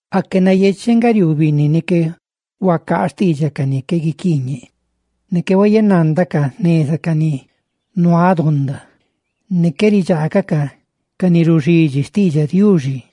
Aque nayecheꞌ nga riuu binni ni qué huacaa xtiidxaꞌ ca ni nuaꞌ donda, ne qué huayenandaca xneza ca ni nuaꞌ donda, ne qué ridxaagacaꞌ ca ni ruxidxi xtiidxaꞌ Diuxi.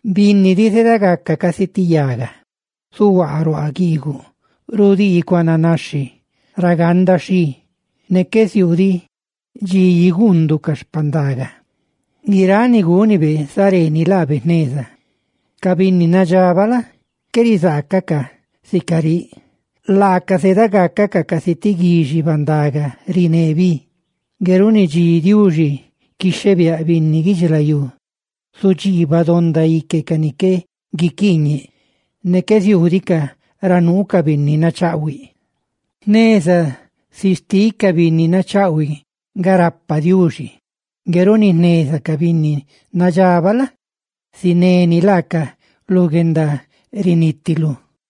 Binni diꞌ, zedagaca casi ti yaga, zuhuaa ruaa guiiguꞌ, rudii cuananaxhi ra ganda xhi, ne qué ziuu diꞌ dxi igundúꞌ ca xpandaga. ¡Guiráꞌ ni gúnibe, zareeni laabe jneza! Ca binni nadxabaꞌ la? qué rizaacacaꞌ sica riꞌ, laaca zedagacacaꞌ casi ti guixi bandaga riné bi. Ngue runi dxi Diuxi quixhebiáꞌ binni guidxilayú, zudxiibaꞌ donda ique ca ni qué guiquiiñeꞌ, ne qué ziuudicaꞌ ra nuu ca binni nachaꞌhuiꞌ. Xneza si xtiꞌ ca binni nachaꞌhuiꞌ nga rapa Diuxi; ngue runi xneza ca binni nadxabaꞌ la? zineni laacaꞌ lu guendarinitilú.